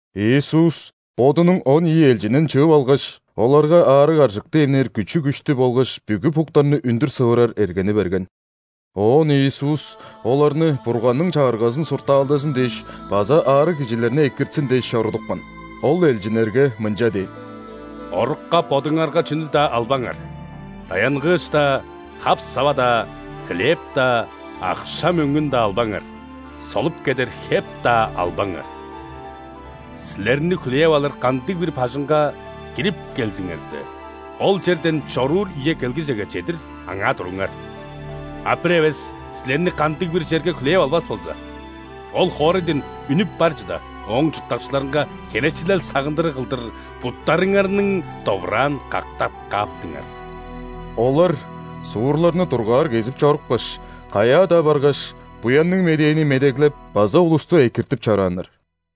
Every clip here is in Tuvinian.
Иисус Бодунуң он ийи элчинин чыып алгаш, оларга аарыг-аржыкты эмнээр күчү-күштү болгаш бүгү буктарны үндүр сывырар эргени берген. Оон Иисус оларны Бурганның Чагыргазын суртаалдазын дээш база аарыг кижилерни экиртсин дээш чорудупкан. Ол элчиннерге мынча дээн: «Орукка бодуңарга чүнү-даа албаңар: даянгыыш-даа, хап-сава-даа, хлеб-даа, акша-мөңгүн-даа албаңар; солуп кедер хеп-даа албаңар. Силерни хүлээп алыр кандыг-бир бажыңга кирип келзиңерзе, ол черден чоруур үе келгижеге чедир аңаа туруңар. А бир эвес силерни кандыг-бир черге хүлээп албас болза, ол хоорайдан үнүп бар чыда, ооң чурттакчыларынга херечилел-сагындырыг кылдыр буттарыңарның довураан кактап кааптыңар». Олар суурларны дургаар кезип чорупкаш, каяа-даа баргаш, Буянныг Медээни медеглеп база улусту экиртип чорааннар.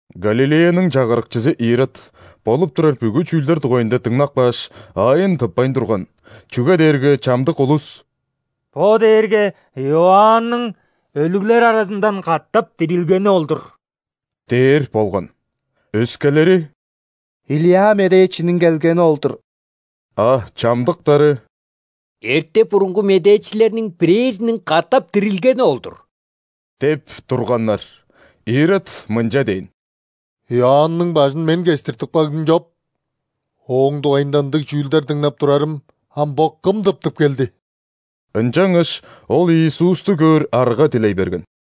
Галилеяның чагырыкчызы Ирод болуп турар бүгү чүүлдер дугайында дыңнап кааш, аайын тыппайн турган, чүге дээрге чамдык улус: «Бо дээрге Иоанның өлүглер аразындан катап дирилгени ол-дур» – дээр болган. Өскелери: «Илия медээчиниң келгени ол-дур», а чамдыктары: «Эрте-бурунгу медээчилерниң бирээзиниң катап дирилгени ол-дур» – деп турганнар. Ирод мынча дээн: «Иоанның бажын мен кестиртип кагдым чоп. Ооң дугайында ындыг чүүлдер дыңнап турарым ам бо Кым тыптып келди?» Ынчангаш ол Иисусту көөр арга дилей берген.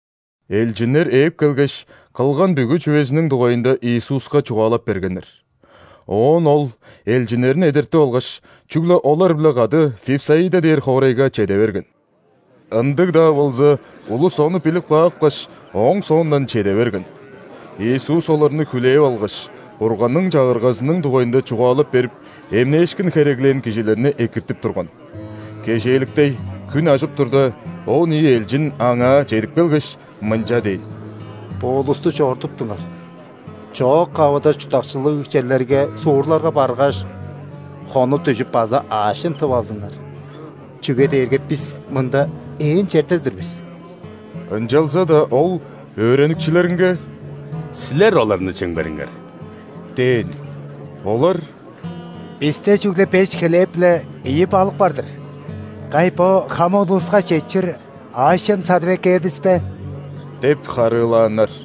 Элчиннер ээп келгеш, кылган бүгү чүвезиниң дугайында Иисуска чугаалап бергеннер. Оон Ол элчиннерин эдертип алгаш, чүгле олар-биле кады Вифсаида дээр хоорайга чеде берген. Ындыг-даа болза, улус ону билип каапкаш, Ооң соондан чеде берген. Иисус оларны хүлээп алгаш, Бурганның Чагыргазының дугайында чугаалап берип, эмнээшкин хереглээн кижилерни экиртип турган. Кежээликтей, хүн ажып турда, он ийи элчин Аңаа чедип келгеш, мынча дээн: «Бо улусту чорудуптуңар, чоок-кавыда чурттакчылыг черлерге, суурларга баргаш, хонуп-дүжүп база аъш-чем тып алзыннар, чүге дээрге бис мында ээн черде-дир бис». Ынчалза-даа Ол өөреникчилеринге: «Силер оларны чемгериңер» – дээн. Олар: «Бисте чүгле беш хлеб биле ийи балык бар-дыр, кай, бо хамык улуска четчир аъш-чем садып эккээр бис бе?» – деп харыылааннар.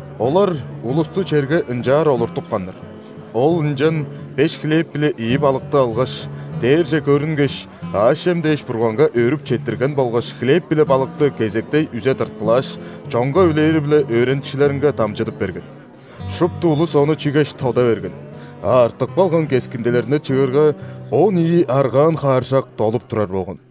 Олар улусту черге ынчаар олуртупканнар. Ол ынчан беш хлеб биле ийи балыкты алгаш, дээрже көрүнгеш, аъш-чем дээш Бурганга өөрүп четтирген болгаш хлеб биле балыкты кезектей үзе тырткылааш, чонга үлээри-биле өөреникчилеринге дамчыдып берген. Шупту улус ону чигеш, тода берген, а артып калган кескиндилерни чыырга, он ийи аргаан хааржак долуп турар болган.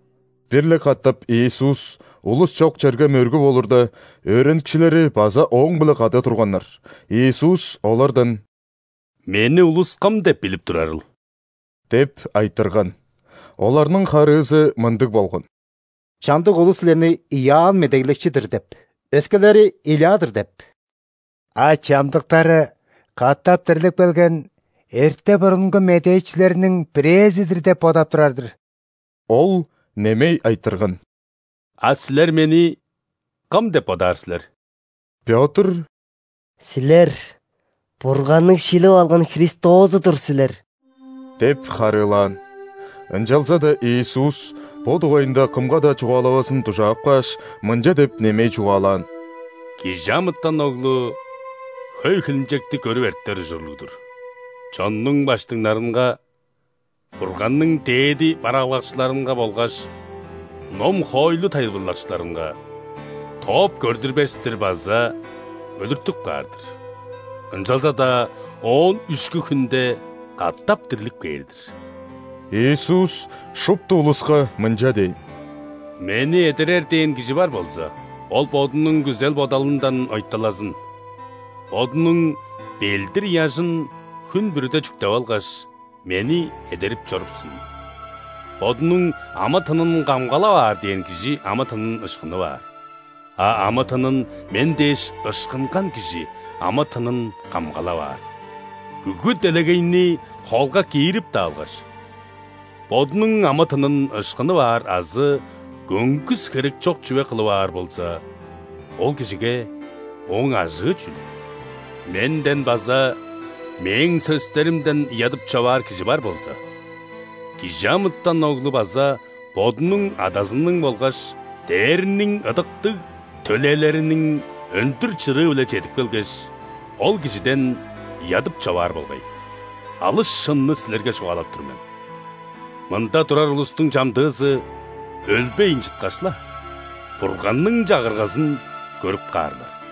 Бир-ле катап Иисус улус чок черге мөргүп олурда, өөреникчилери база Ооң-биле кады турганнар. Иисус олардан: «Мени улус Кым деп билип турарыл?» – деп айтырган. Оларның харыызы мындыг болган: «Чамдык улус Силерни Иоанн Медеглекчи-дир деп, өскелери – Илия-дыр деп, а чамдыктары – катап дирлип келген эрте-бурунгу медээчилерниң бирээзи-дир деп бодап турар-дыр». Ол немей айтырган: «А силер Мени Кым деп бодаар силер?» Пётр: «Силер Бурганның шилип алган Христозу-дур силер» – деп харыылаан. Ынчалза-даа Иисус бо дугайында кымга-даа чугаалавазын дужаап кааш, мынча деп немей чугаалаан: «·Кижи амытан Оглу хөй хилинчекти көрүп эртер ужурлуг-дур, чоннуң ·баштыңнарынга, Бурганның дээди бараалгакчыларынга болгаш ном-хоойлу тайылбырлакчыларынга тооп көрдүрбес-тир база өлүртүп каар-дыр, ынчалза-даа оон үшкү хүнде катап дирлип кээр-дир». Иисус шупту улуска мынча дээн: «Мени эдерер дээн кижи бар болза, ол бодунуң күзел-бодалындан ойталазын, бодунуң ·белдир-ыяжын хүн бүрүде чүктеп алгаш, Мени эдерип чорупсун. Бодунуң амы-тынын камгалап аар дээн кижи амы-тынын ышкынып аар, а амы-тынын Мен дээш ышкынган кижи амы-тынын камгалап аар. Бүгү делегейни холга киирип-даа алгаш, бодунуң амы-тынын ышкынып аар азы көңгүс херекчок чүве кылып аар болза, ол кижиге ооң ажыы чүл? Менден база Мээң сөстеримден ыядып-човаар кижи бар болза, ·Кижи амытан Оглу база Бодунуң, Адазының болгаш дээрниң ыдыктыг төлээлериниң өндүр чырыы-биле чедип келгеш, ол кижиден ыядып-човаар болгай. Алыс шынны силерге чугаалап тур мен: мында турар улустуң чамдыызы, өлбейн чыткаш-ла, Бурганның Чагыргазын көрүп каарлар».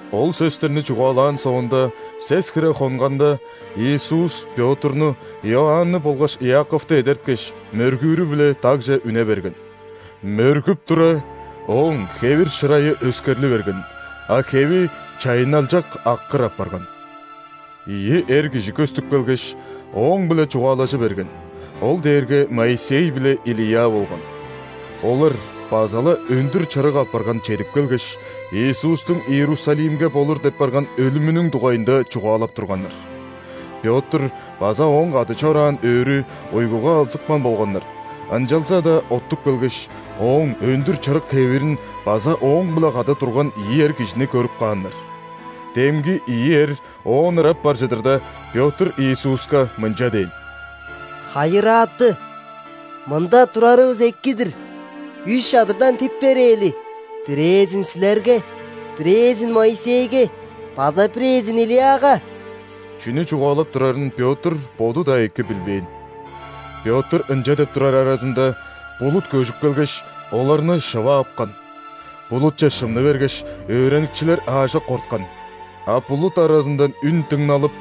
Ол сөстерни чугаалаан соонда сес хире хонганда, Иисус Пётрну, Иоанны болгаш Иаковту эдерткеш, мөргүүрү-биле дагже үне берген. Мөргүп тура, Ооң хевир-шырайы өскерли берген, а хеви чайынналчак аккыр апарган. Ийи эр кижи көстүп келгеш, Ооң-биле чугаалажы берген, ол дээрге Моисей биле Илия болган. Олар база-ла өндүр чырык апарган чедип келгеш, Иисустуң Иерусалимге болур деп барган өлүмүнүң дугайында чугаалап турганнар. Пётр база ооң кады чораан өөрү уйгуга алзыпкан болганнар, ынчалза-даа оттуп келгеш, Ооң өндүр чырык хевирин база Ооң-биле кады турган ийи эр кижини көрүп кааннар. Демги ийи эр Оон ырап бар чыдырда, Пётр Иисуска мынча дээн: «Хайырааты, мында турарывыс эки-дир! Үш чадырдан тип берээли: бирээзин – Силерге, бирээзин – Моисейге база бирээзин – Илияга». Чүнү чугаалап турарын Пётр боду-даа эки билбээн. Пётр ынча деп турар аразында, булут көжүп келгеш, оларны шыва апкан. Булутче шымны бергеш, өөреникчилер аажок корткан. А булут аразындан үн дыңналып: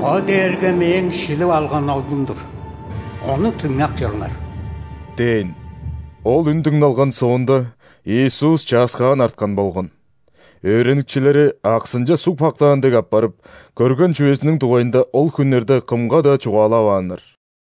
«Бо дээрге Мээң шилип алган Оглум-дур, Ону дыңнап чоруңар» – дээн. Ол үн дыңналган соонда, Иисус чааскаан арткан болган. Өөреникчилери аксынче суг пактаан дег апарып, көрген чүвезиниң дугайында ол хүннерде кымга-даа чугаалавааннар.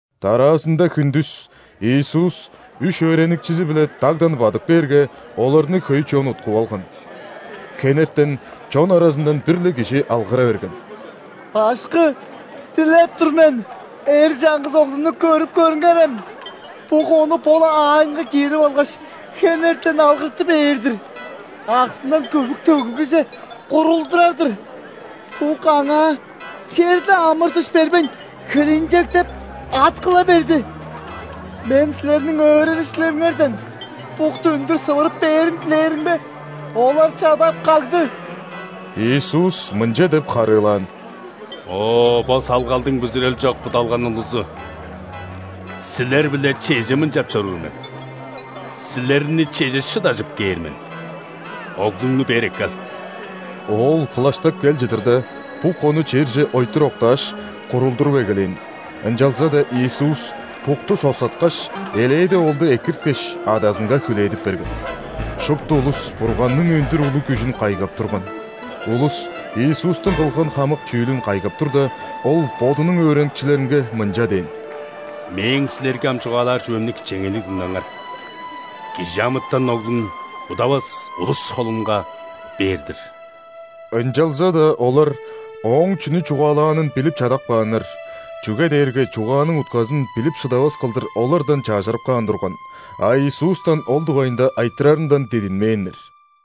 Дараазында хүндүс Иисус үш өөреникчизи-биле дагдан бадып кээрге, оларны хөй чон уткуп алган. Хенертен чон аразындан бир-ле кижи алгыра берген: «Башкы! Дилеп тур мен, эр чаңгыс оглумну көрүп көрүңерем! Бук ону бо-ла аайынга киирип алгаш, хенертен алгырты бээр-дир, аксындан көвүк төгүлгүже курулдурар-дыр. Бук аңаа черле амыр-дыш бербейн хилинчектеп, ат кыла берди. Мен Силерниң өөреникчилериңерден букту үндүр сывырып бээрин дилээримге, олар чадап кагды». Иисус мынча деп харыылаан: «О, бо салгалдың бүзүрел чок, будалган улузу! Силер-биле чеже мынчап чоруур мен, силерни чеже шыдажып кээр мен? Оглуңну бээр эккел». Оол кылаштап кел чыдырда, бук ону черже ойтур октааш, курулдуруп эгелээн, ынчалза-даа Иисус букту соксаткаш, элээди оолду экирткеш, адазынга хүлээдип берген. Шупту улус Бурганның өндүр улуг күжүн кайгап турган. Улус Иисустуң кылган хамык чүүлүн кайгап турда, Ол Бодунуң өөреникчилеринге мынча дээн: «Мээң силерге ам чугаалаар чүвемни кичээнгейлиг дыңнаңар: ·Кижи амытан Оглун удавас улус холунга тудуп бээр-дир». Ынчалза-даа олар Ооң чүнү чугаалаанын билип чадап кааннар, чүге дээрге чугааның утказын билип шыдавас кылдыр олардан чажырып каан турган, а Иисустан ол дугайында айтырарындан дидинмээннер.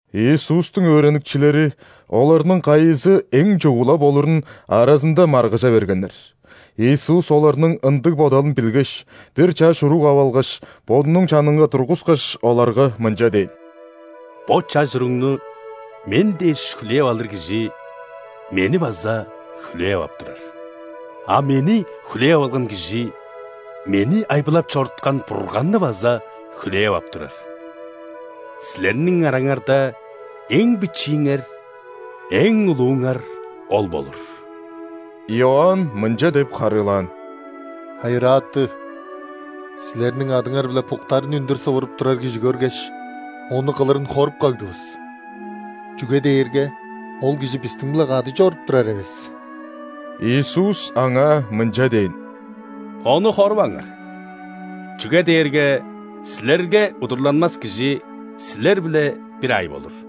Иисустуң өөреникчилери оларның кайызы эң чугула болурун аразында маргыжа бергеннер. Иисус оларның ындыг бодалын билгеш, бир чаш уруг ап алгаш, Бодунуң чанынга тургускаш, оларга мынча дээн: «Бо чаш уругну Мен дээш хүлээп алыр кижи Мени база хүлээп ап турар. А Мени хүлээп алган кижи Мени айбылап чоруткан Бурганны база хүлээп ап турар. Силерниң араңарда эң бичииңер эң улууңар ол болур». Иоанн мынча деп харыылаан: «Хайырааты! Силерниң адыңар-биле буктарны үндүр сывырып турар кижи көргеш, ону кылырын хоруп кагдывыс, чүге дээрге ол кижи бистиң-биле кады чоруп турар эвес». Иисус аңаа мынча дээн: «Ону хоруваңар, чүге дээрге силерге удурланмас кижи силер-биле бир аай болур».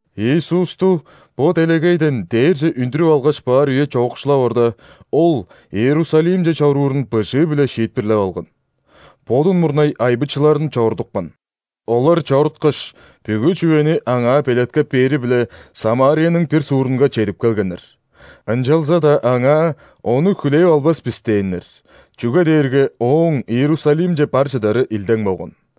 Иисусту бо делегейден дээрже үндүрүп алгаш баар үе чоокшулап орда, Ол Иерусалимче чоруурун быжыы-биле шиитпирлеп алган. Бодун мурнай айбычыларын чорудупкан. Олар чоруткаш, бүгү чүвени Аңаа белеткеп бээри-биле Самарияның бир суурунга чедип келгеннер. Ынчалза-даа аңаа: «Ону хүлээп албас бис» – дээннер, чүге дээрге Ооң Иерусалимче бар чыдары илдең болган.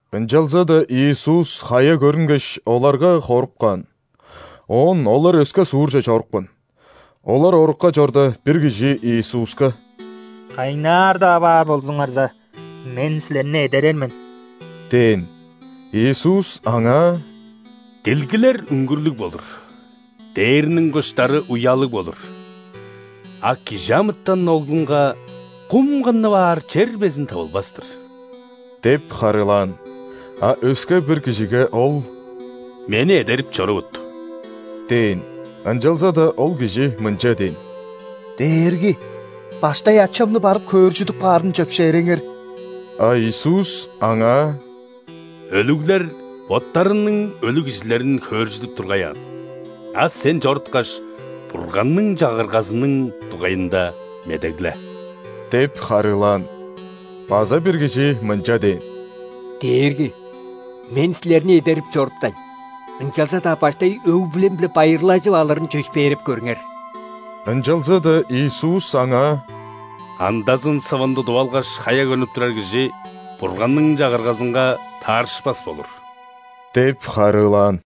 Ынчалза-даа Иисус хая көрүнгеш, оларга хоруп каан. Оон олар өске суурже чорупкан. Олар орукка чорда, бир кижи Иисуска: «Кайнаар-даа баар болзуңарза, мен Силерни эдерер мен» – дээн. Иисус аңаа: «Дилгилер үңгүрлүг болур, дээрниң куштары уялыг болур, а ·Кижи амытан Оглунга кум кыннып аар чер безин тывылбас-тыр» – деп харыылаан. А өске бир кижиге Ол: «Мени эдерип чорувут» – дээн. Ынчалза-даа ол кижи мынча дээн: «Дээрги! Баштай ачамны барып хөөржүдүп каарын чөпшээреңер». А Иисус аңаа: «Өлүглер боттарының өлүг кижилерин хөөржүдүп тургай аан, а сен чоруткаш, Бурганның Чагыргазының дугайында медегле» – деп харыылаан. База бир кижи мынча дээн: «Дээрги, мен силерни эдерип чоруптайн! Ынчалза-даа баштай өг-бүлем-биле байырлажып алырын чөпшээреп көрүңер». Ынчалза-даа Иисус аңаа: «Андазын сывын тудуп алгаш, хая көрнүп турар кижи Бурганның Чагыргазынга таарышпас болур» – деп харыылаан.